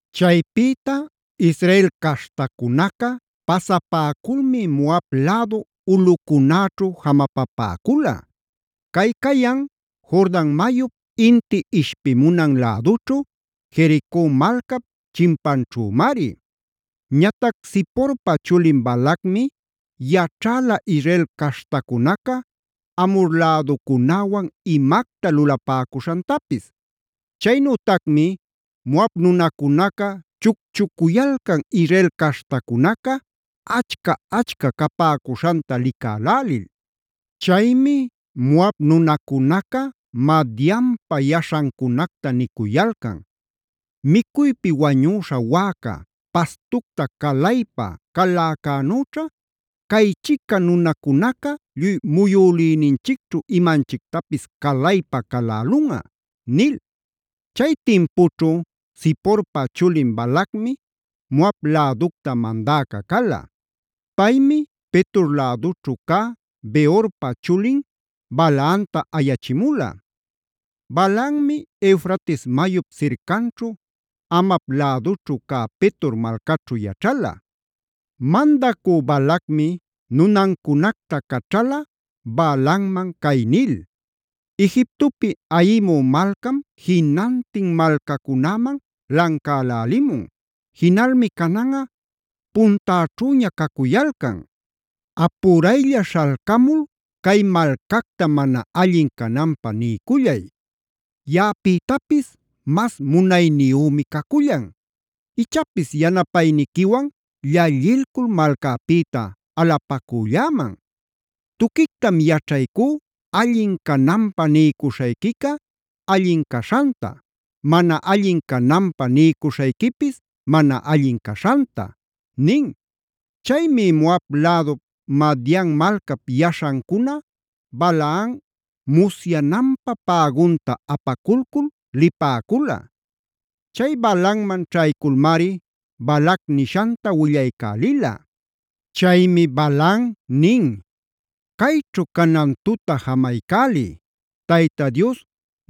Chaypïta Israel caśhtacunaca pasapäculmi Moab lädu ulꞌucunäćhu jamapapäcula; cay cayan Jordan mayup inti ishpimunan lädućhu, Jerico malcap chimpanćhümari. Ñatac Ziporpa chulin Balacmi yaćhäla Israel caśhtacunaca Amhor läducunäwan imacta lulapäcuśhantapis. Chaynütacmi Moab nunacunaca chucchucuyalcan Israel caśhtacunaca achca-achca capäcuśhanta licälälil. Chaymi Moab nunacunaca Madianpa yaśhancunacta nicuyalcan: “Micuypi wañüśha wäca, pastucta calaypa caläcänüćha, caychica nunacunaca lluy muyülïninchicćhu imanchictapis calaypa calälunꞌa” nil. Chay timpućhu Ziporpa chulin Balacmi Moab läducta mandäca cala. Paymi Petor lädućhu cä Beorpa chulin Balaamtaa ayachimula; Balaammi Eufrates mayup sircanćhu Amav lädućhu cä Petor malcaćhu yaćhala. Mandacü Balacmi nunancunacta caćhala Balaamman cay nil: “Egiptopi ayimu malcam jinantin malcacunäman lancälälimun; jinalmi cananꞌa puntäćhüña cacuyalcan. Apuraylla śhalcamul cay malcacta mana allin cananpä niycullay; yaꞌapïtapis mas munayniyümi cacullan. Ichapis yanapayniquiwan llallilcul malcäpïta alapacülläman. Tuquictam yaćhaycú allin cananpä niycuśhayquica allin caśhanta, mana allin cananpä niycuśhayquipis mana allin caśhanta” nin. Chaymi Moab lädup, Madian malcap yaśhancuna Balaam musyananpä pägunta apaculcul lipäcula. Chay Balaamman ćhayculmari Balac nishanta willaycälila. Chaymi Balaam nin: “Cayćhu canan tuta jamaycäliy. Tayta Dios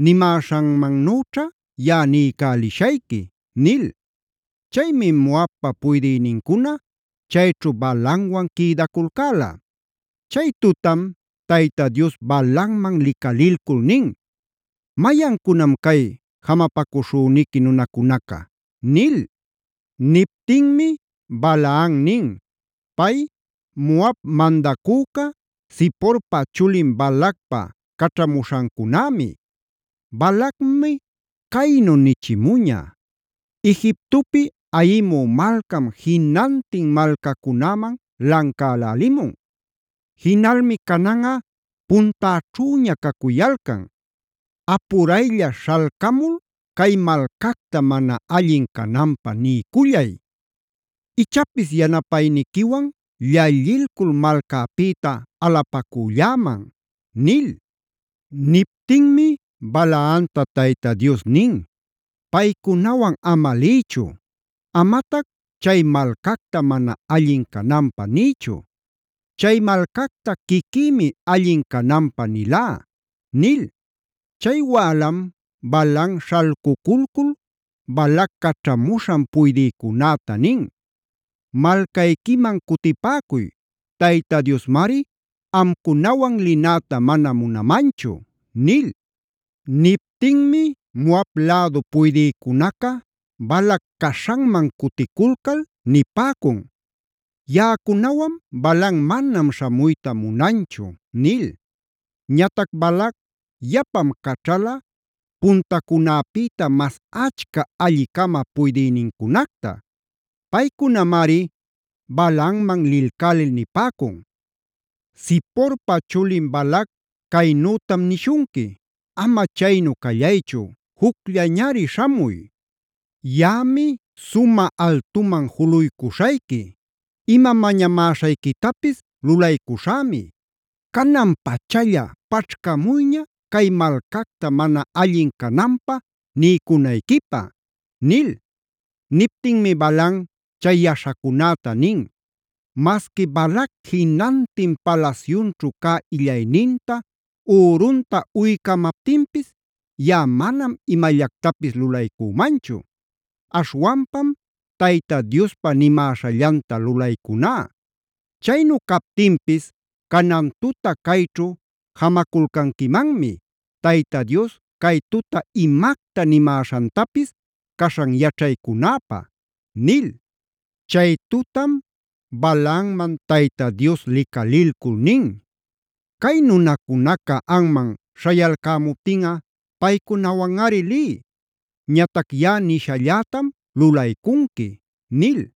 nimäśhanmannüćha yaꞌa niycälishayqui” nil. Chaymi Moabpa puydïnincuna chayćhu Balaamwan quïdaculcäla. Chay tutam Tayta Dios Balaamman licalilcul nin: “¿Mayancunam cay jamapacuśhüniqui nunacunaca?” nil. Niptinmi Balaam nin: “Pay Moab mandacüca, Ziporpa chulin Balacpa caćhamuśhancunämi. Balacmi caynu nichimuña: ‘Egiptopi ayimü malcam jinantin malcacunäman lancälälimun; jinalmi cananꞌa puntäćhüña cacuyalcan. Apuraylla śhalcamul cay malcacta mana allin cananpä niycullay. Ichapis yanapayniquiwan llallilcul malcäpïta alapacülläman’” nil. Niptinmi Balaamta Tayta Dios nin: “Paycunawan ama liychu; amatac chay malcacta mana allin cananpä niychu. Chay malcacta quiquïmi allin cananpä nilá” nil. Chay wälam Balaam śhalcuculcul Balac caćhamuśhan puydïcunäta nin: “Malcayquiman cutipäcuy. Tayta Diosmari amcunawan linäta mana munamanchu” nil. Niptinmi Moab lädu puydïcunaca Balac caśhanman cuticulcal nipäcun: “Yaꞌacunawan Balaam manam śhamuyta munanchu” nil. Ñatac Balac yapam caćhala puntacunäpïta mas achca alli-cama puydïnincunacta. Paycunamari Balaamman lilcälil nipäcun: “Ziporpa chulin Balac caynütam nishunqui: Ama chaynu callaychu, jucllañari śhamuy. Yaꞌami sumä altuman juluycuśhayqui; ima mañamäśhayquitapis lulaycuśhämi. Canan-pachalla paćhcamuyña cay malcacta mana allin cananpä niycunayquipä” nil. Niptinmi Balaam chay yaśhacunäta nin: “Masqui Balac jinantin palasyunćhu cä illayninta, ürunta uycamaptinpis yaꞌa manam imallactapis lulaycümanchu. Aśhwanpam Tayta Diospa nimäśhallanta lulaycuná. Chaynu captinpis canan tuta cayćhu jamaculcanquimanmi, Tayta Dios cay tuta imacta nimäśhantapis caśhan yaćhaycunäpä” nil. Chay tutam Balaamman Tayta Dios licalilcul nin: “Cay nunacunaca anman śhayalcämuptinꞌa paycunawanꞌari liy. Ñatac yaꞌa nishallätam lulaycunqui” nil.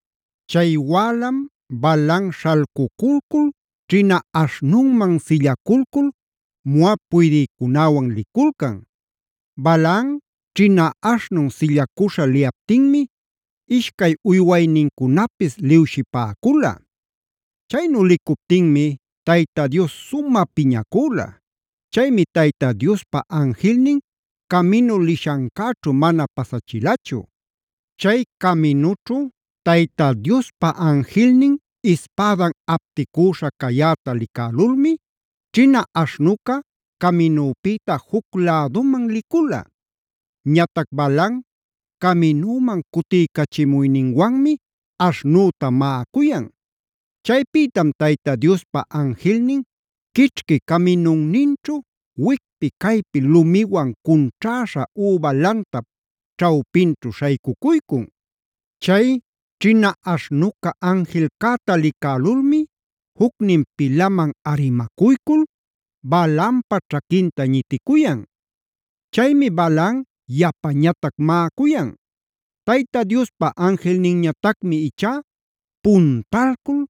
Chay wälam Balaam śhalcuculcul ćhina aśhnunman sillaculcul Moab puydïcunäwan liculcan. Balaam ćhina aśhnun sillacuśha liyaptinmi ishcay uywaynincunapis liwshipäcula. Chaynu licuptinmi Tayta Dios sumä piñacüla. Chaymi Tayta Diospa anjilnin caminu lishancäćhu mana pasachilachu. Chay caminućhu Tayta Diospa anjilnin ispädan apticüśha cayäta licälulmi ćhina aśhnuca caminüpïta juc läduman licula. Ñatac Balaam caminüman cutiycachimuyninwanmi aśhnüta maꞌacuyan. Chaypïtam Tayta Diospa anjilnin quićhqui caminunninćhu, wicpi caypi lumiwan cunćhäśha üba lantap ćhawpinćhu śhaycucuycun. Chay ćhina aśhnuca anjilcäta licälulmi jucnin pilaman arimacuycul Balaampa ćhaquinta ñiticuyan. Chaymi Balaam yapañatac maꞌacuyan. Tayta Diospa anjilninñatacmi ichá puntalcul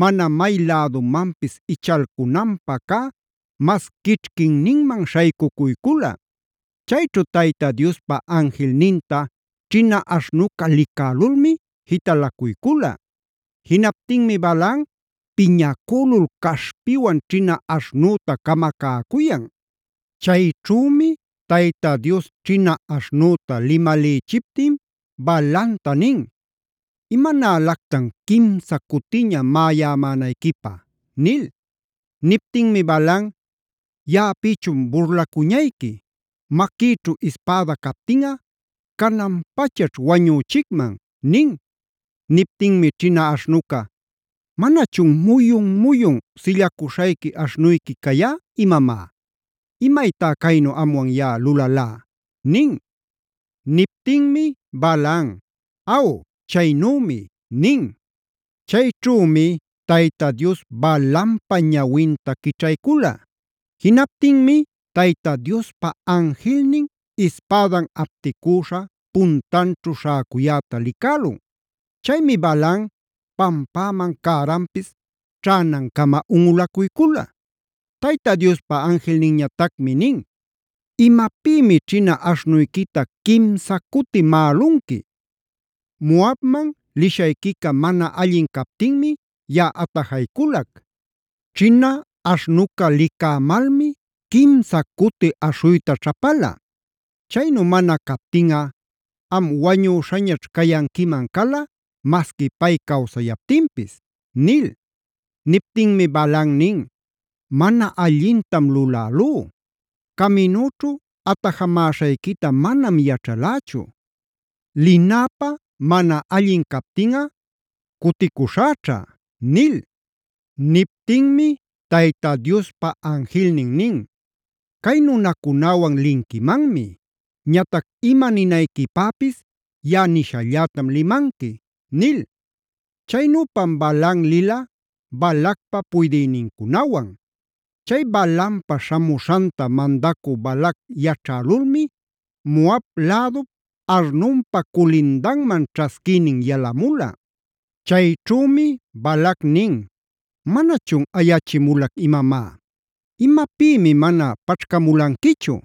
mana may lädumanpis ichalcunapä cä mas quićhquinninman śhaycucuycula. Chayćhu Tayta Diospa anjilninta ćhina aśhnuca licälulmi jitalacuycula. Jinaptinmi Balaam piñacülul caśhpiwan ćhina aśhnüta camacäcuyan. Chayćhümi Tayta Dios ćhina aśhnüta limälïchiptin Balaamta nin: “¿Imanälactan quimsa cutiña maꞌayämänayquipä?” nil. Niptinmi Balaam: “Yaꞌapïchun burlacuñayqui. ¡Maquïćhu ispäda captinꞌa cananpachaćh wañüchicman!” nin. Niptinmi ćhina aśhnuca: “¿Manachun muyun-muyun sillacuśhayqui aśhnuyqui cayá imamá? ¿Imaytá caynu amwan yaꞌa lulalá?” nin. Niptinmi Balaam: “Aw, chaynümi” nin. Chayćhümi Tayta Dios Balaampa ñawinta quićhaycula. Jinaptinmi Tayta Diospa anjilnin ispädan apticüśha puntanćhu śhäcuyäta licälun. Chaymi Balaam pampämam cäranpis ćhänancama unꞌulacuycula. Tayta Diospa anjilninñatacmi nin: “¿Imapïmi ćhina aśhnuyquita quimsa cuti maꞌalunqui? Moabman lishayquica mana allin captinmi yaꞌa atajacuyculac. Ćhina aśhnuca licämalmi quimsa cuti aśhuyta ćhapala. Chaynu mana captinꞌa am wañüśhañaćh cayanquiman, masqui pay cawsayaptinpis” nil. Niptinmi Balaam nin: “Mana allintam lulälú. Caminüćhu atajamäśhayquita manam yaćhalächu. Linäpä mana allin captinꞌa cuticuśhäćha” nil. Niptinmi Tayta Diospa anjilnin nin: “Cay nunacunäwan linquimanmi. Ñatac ima ninayquipäpis yaꞌa nishallätam limanqui” nil. Chaynüpam Balaam lila Balacpa puydïnincunawan. Chay Balaampa śhamuśhanta mandacü Balac yaćhälulmi Moab lädup Arnonpa culindanman ćhasquïnin yalamula. Chayćhümi Balac nin: “¿Manachun ayachimulac imamá? ¿Imapïmi mana paćhcamulanquichu?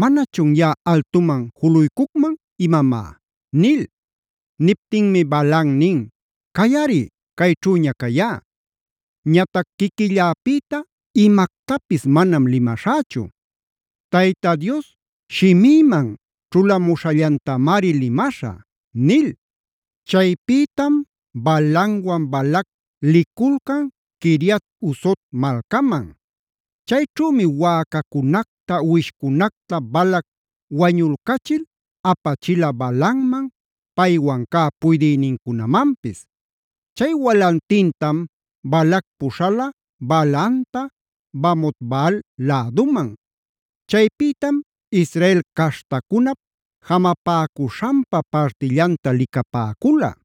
¿Manachun yaꞌa altuman juluycucman imamá?” nil. Niptinmi Balaam nin: “Cayꞌari, cayćhüña cayá. Ñatac quiquilläpïta imactapis manam limaśhächu; Tayta Dios shimïman ćhulamuśhallantamari limaśhä” nil. Chaypïtam Balaamwan Balac liculcan Quiriat-huzot malcaman. Chayćhümi wäcacunacta uwishcunacta Balac wañulcachil apachila Balaamman, paywan cä puydïnincunamanpis. Chay walantintam Balac puśhala Balaamta Bamot-baal läduman. Chaypïtam Israel caśhtacunap jamapäcuśhanpa partillanta licapäcula.